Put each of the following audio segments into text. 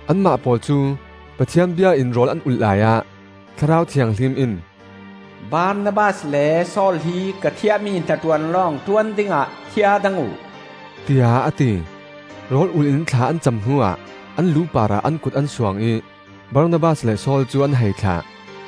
Anmah pawl cu Pathian bia in rawl an ulh laiah Thlarau Thianghlim in, “Barnabas le Saul hi ka thiahmi hnaṭuan lawng ṭuan dingah thiadang uh,” tiah a ti. Rawl ul in thla an cam hnuah an lu parah an kut an suang ih Barnabas le Saul cu an hei thlah.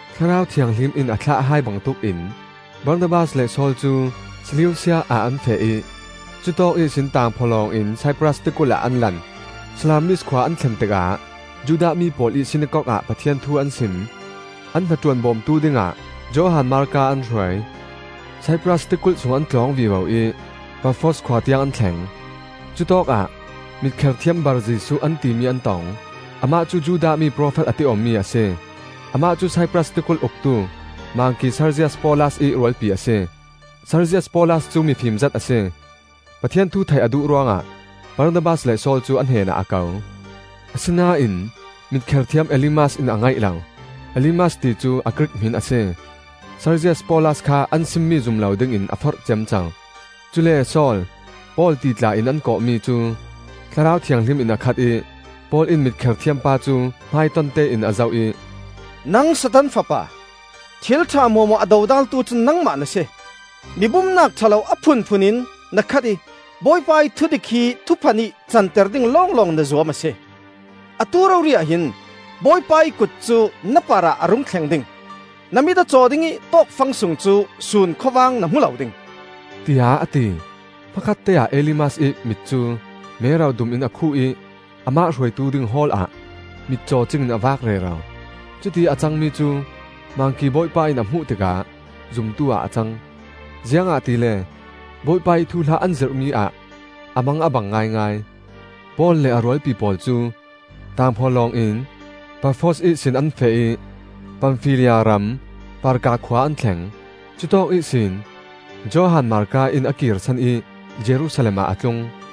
Thlarau Thianghlim in a thlah hai bangtuk in Barnabas le Saul cu Seleusia ah an feh ih cutawk ihsin tangphawlawng in Saipras tikulh ah an lan. Salamis khua an thlen tikah Judah mi pawl ih sinakok ah Pathian thu an sim. An hnaṭuan bawmtu dingah Johan Marka an hruai. Saipras tikulh sung an tlawng vivo ih Pafos khua tiang an thleng. Cutawk ah mitkher thiam Bar-Jesuh an timi an tong. Amah cu Judah mi, profet a ti awmi a si. Amah cu Saipras tikulh uktu Mangki Serzias Paulas ih rualpi a si. Serzias Paulas cu mifim zet a si. Pathian thu theih a duh ruangah Barnabas le Saul cu a hnenah a ko. Asinain mitkher thiam Elimas in a ngaih lo; (Elimas ti cu a Grik hmin a si.) Serzias Paulas kha an simmi zum lo dingin a forh ciamco. Cule Saul, Paul ti tla in an kawhmi, cu Thlarau Thianghlim in a khat ih Paul in mitkher thiam pa cu hmaiton tein a zoh ih, “Nang Satan fapa! Thilṭha hmuahhmuah a dodaltu cu nangmah na si. Mi bumnak ṭha lo a phunphun in na khat ih Bawipa ih thudik hi thuphan ih canter ding lawnglawng na zuam a si. Atu rori-ah hin Bawipa ih kut cu na parah a rung thleng ding, na mit a caw ding ih tawkfang sung cu sun khawvang na hmu lo ding,” tiah a ti. Hmakhatte-ah Elimas ih mit cu mero dum in a khuh ih amah hruaitu ding hawl ah mitcaw cingin a vak rero. Cutiih a cangmi cu Mangki bawipa in a hmuh tikah zumtu-ah a cang; ziangahtile Bawipa ih thuhla an zirhmi ah a mang a bang ngaingai. Paul le a rualpi pawl cu tangphawlawng in Pafos ihsin an feh ih Pamfilia ram Perga khua an thleng. Cutawk ihsin Johan Marka in a kirsan ih Jerusalem ah a tlung.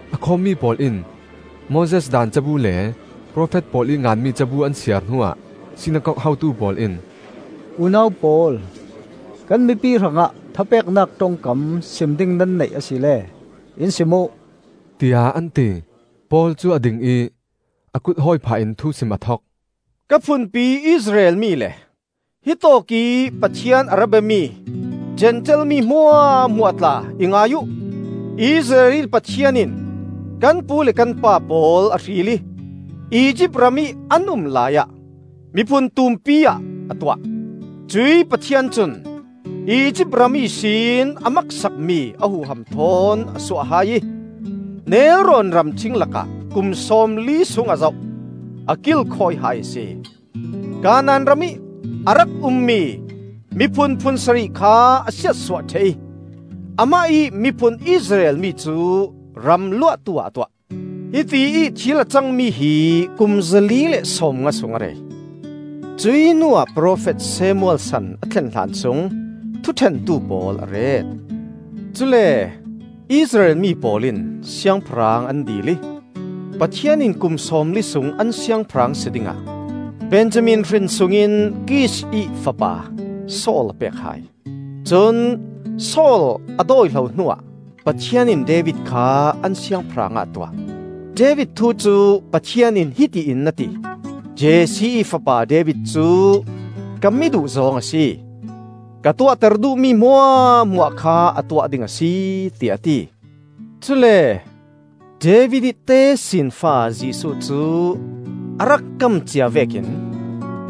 A khawmmi pawl in Moses Daan cabu le profet pawl ih nganmi cabu an siar hnuah sinakok hotu pawl in, “Unau pawl, kan mipi hrangah thapeknak ṭongkam sim ding nan neih asile in sim uh,” tiah an ti. Paul cu a ding ih a kut hawi phah in thusim a thok: “Ka phunpi Israel mi le hitawk ih Pathian a ra biami Zentail mi hmuahhmuah tla, i ngai uh! Israel ih Pathian in kan pu le kan pa pawl a hril ih Izipt ramih an um laiah miphun tumpi ah a tuah. Cuih Pathian cun Izipt ram ihsin a maksak mi a huham thawn a suah hai ih, nelrawn ramṭhing lakah kum sawmli sung a zoh, a kilkhawi hai a si. Kanaan ramih a rak ummi miphun phun sarih kha a siatsuah ṭheh ih amah ih miphun Israel mi cu ram luahtu ah a tuah. Hitiih thil a cangmi hi kum zali le sawmnga sung a rei. Cuih hnuah profet Samuel san a thlen hlan sung Thuṭhentu pawl a ret. Cule Israel mi pawl in siangpahrang an dil ih Pathian in kum sawmli sung an siangpahrang si dingah Benjamin hrin sungin Kish ih fapa Saul a pek hai. Cun Saul a dawihlo hnuah Pathian in David kha an siangpahrang ah a tuah. David thu cu Pathian in hiti in a ti: ‘Jesse ih fapa David cu ka mi duhzawng a si. Ka tuahter duhmi hmuahhmuah kha a tuah ding a si,’ tiah a ti. Cule David ih tesinfa Jesuh cu a rak kam cia vekin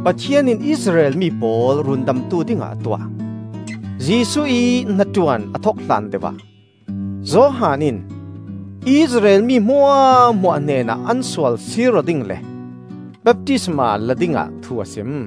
Pathian in Israel mi pawl Rundamtu dingah a tuah. Jesuh ih hnaṭuan a thok hlan deuh ah, Johan in Israel mi hmuahhmuah hnenah an sual sir aw ding le baptisma la dingah thu a sim.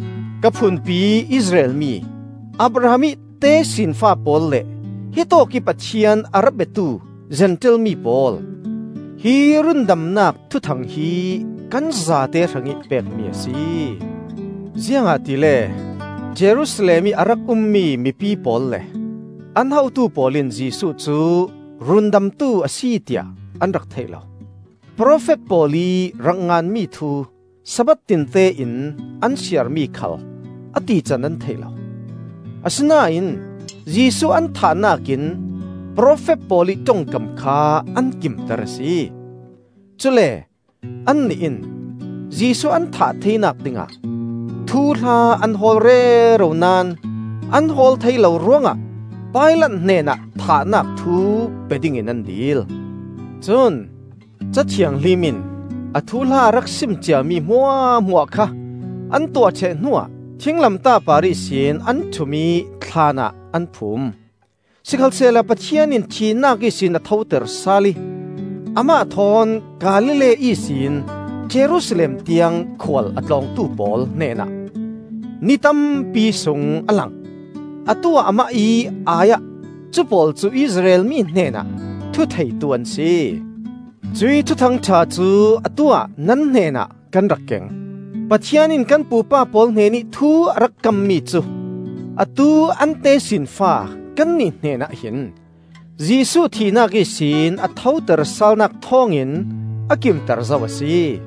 Ka phunpi Israel mi, Abraham ih tesinfa pawl le hitawk ih Pathian a ra biatu Zentail mi pawl, hi rundamnak Thuthang hi kan zate hrangih pekmi a si. Ziangahtile Jerusalem ih a rak ummi mipi pawl le an hotu pawl in Jesuh cu Rundamtu a si tiah an rak thei lo. Profet pawl ih rak nganmi thu Sabbath tinte in an siarmi khal a tican an thei lo. Asinain Jesuh an thahnak in profet pawl ih ṭongkam kha an kimter a si. Cule annih in Jesuh an thah theinak dingah thuhla an hawl rero naón, an hawl thei lo ruangah Pilat hnenah thahnak thu pe ding in an dil. Cun Ca Thianghlim in a thuhla a rak sim ciami hmuahhmuah kha an tuah ṭheh hnuah thinglamtah par ihsin an ṭhum ih thlaan ah an phum. Sikhalsehla Pathian in thihnak ihsin a thoter sal ih, amah thawn Galilee ihsin Jerusalem tiang khual a tlawngtu pawl hnenah ni tampi sung a lang. Atu-ah Amah ih ai-ah cupawl cu Israel mi hnenah thutheitu an si. Cuih Thuthang ṭha cu atu-ah nan hnenah kan rak keng. Pathian in kan pupa pawl hnenih thu a rak kammi cu atu an tesinfa kannih hnenah hin Jesuh thihnak ihsin a thoter salnak thawngin a kimter zo a si.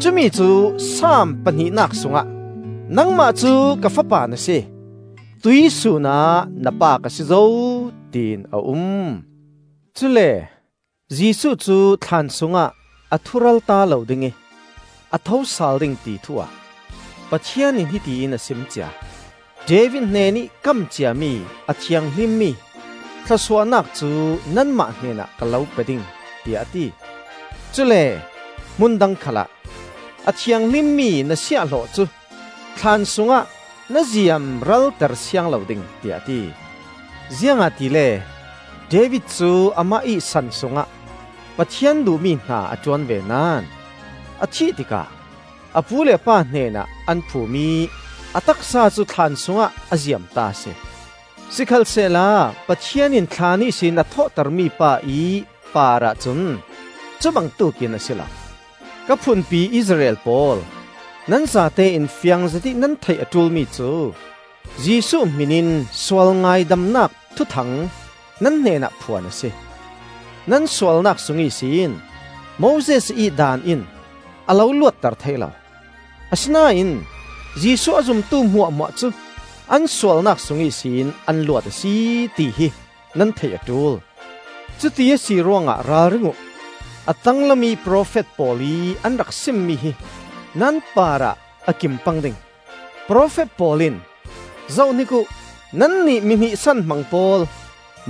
Cumi cu Saam pahnihnak sungah: ‘Nangmah cu ka Fapa na si, tuihsun ah na Pa ka si zo,’ tiin a um. Cule Jesuh cu thlaan sungah a thu-ralta lo ding ih a thosal ding ti thu-ah Pathian in hiti in a sim cia. ‘David hnenih kam ciami a thianghlimmi thluasuahnak cu nanmah hnenah ka lo pe ding,’ tiah a ti. Cule hmun dang khalah, ‘A thianghlimmi na siahhlawh cu thlaan sungah na ziamralter siang lo ding,’ tiah a ti. Ziangahtile David cu amah ih san sungah Pathian duhmi hna a ṭuan ve naón, a thih tikah a pu le a pa hnenah an phum ih a taksa cu thlaan sungah a ziamta a si. Sikhalsehla Pathian in thlaan ihsin a thawhter mipa-ih parah cun cubangtuk in a si lo. Ka phunpi Israel pawl, nan zatein fiang zetih nan theih a ṭul mi cu: Jesuh hmin in sual ngaidamnak thuthang nan hnenah phuan a si; nan sualnak sung ihsin Moses ih Daan in a lo luatter thei lo, asinain Jesuh a zumtu hmuahhmuah cu an sualnak sung ihsin an luat a si, tihi nan theih a ṭul. Cuti a si ruangah ralring uh, a tanglamih profet pawl ih an rak simmi hi nan parah a kim pang ding. Profet pawl in: ‘Zohhnik uh! Nannih mi hnihsan hmang pawl: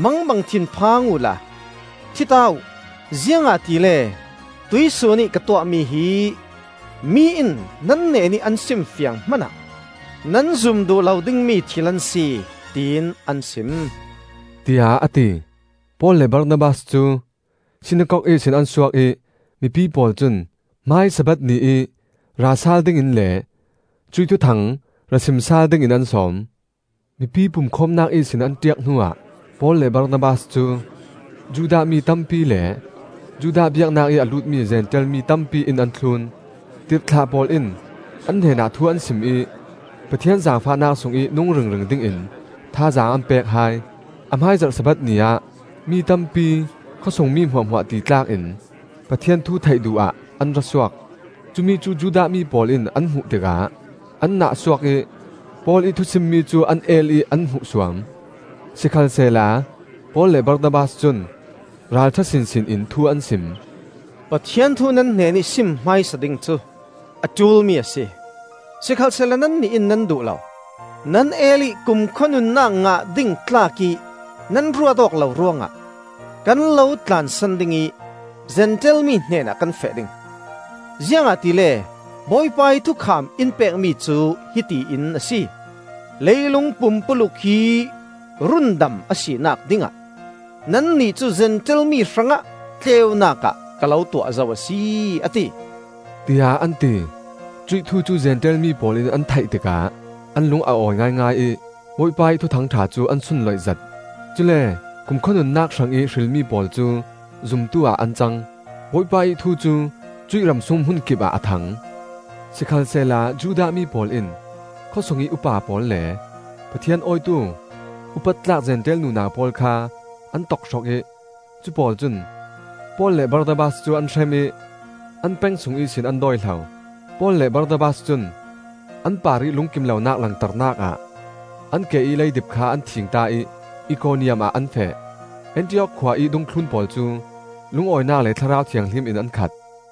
Mangbang thinphang uhla thi ta uh! Ziangahtile tuihsun ih ka tuahmi hi, mi in nan hnenih an simfiang hmanah nan zum duh lo dingmi thil an si,’ tiin an sim,” tiah a ti. Paul le Barnabas cu sinakok ihsin an suak ih mipi pawl cun hmai Sabbath ni ih ra sal dingin le cuih Thuthang ra sim sal dingin an sawm. Mipi pumkhawmnak ihsin an ṭiak hnuah Paul le Barnabas cu Judah mi tampi le Judah biaknak ih a lutmi Zentail mi tampi in an thlun. Tirhthlah pawl in an hnenah thu an sim ih Pathian zaangfahnak sungih nung ringring dingin thazaang an pek hai. A hmaizarh Sabbath ni ah mi tampi, khawsung mi hmuahhmuah titlak in Pathian thu theih duh ah an ra suak. Cumi cu Judah mi pawl in an hmuh tikah an nahsuak ih Paul ih thusimmi cu an el ih an hmuhsuam. Sikhalsehla Paul le Barnabas cun ralṭha sinsin in thu an sim. “Pathian thu nan hnenih sim hmaisa ding cu a ṭulmi a si. Sikhalsehla nannih in nan duh lo, nan el ih kumkhua nunnak ngah ding tlak ih nan ruat awk lo ruangah kan lo tlansan ding ih Zentail mi hnenah kan feh ding. Ziangahtile Bawipa ih thukham in pekmi cu hiti in a si: ‘Leilung pumpuluk hi rundam a sinak dingah, nannih cu Zentail mi hrangah tleunak ah ka lo tuah zo a si,’ a ti,” tiah an ti. Cuih thu cu Zentail mi pawl in an theih tikah an lung a awi ngaingai ih Bawipa ih Thuthang ṭha cu an sunloih zet. Cule kumkhua nunnak hrangih hrilmi pawl cu zumtu-ah an cang. Bawipa ih thu cu cuih ramsung hmunkipah a thang. Sikhalsehla Judah mi pawl in khawsungih upa pawl le Pathian awitu upat tlak Zentail nunau pawl kha an tokhrok ih cu pawl cun Paul le Barnabas cu an hrem ih an peng sung ihsin an dawihlo. Paul le Barnabas cun an parih lungkim lonak langternak ah an ke ih leidip kha an thingta ih Ikoniam ah an feh. Antiok khua ih dungthlun pawl cu lungawinak le Thlarau Thianghlim in an khat.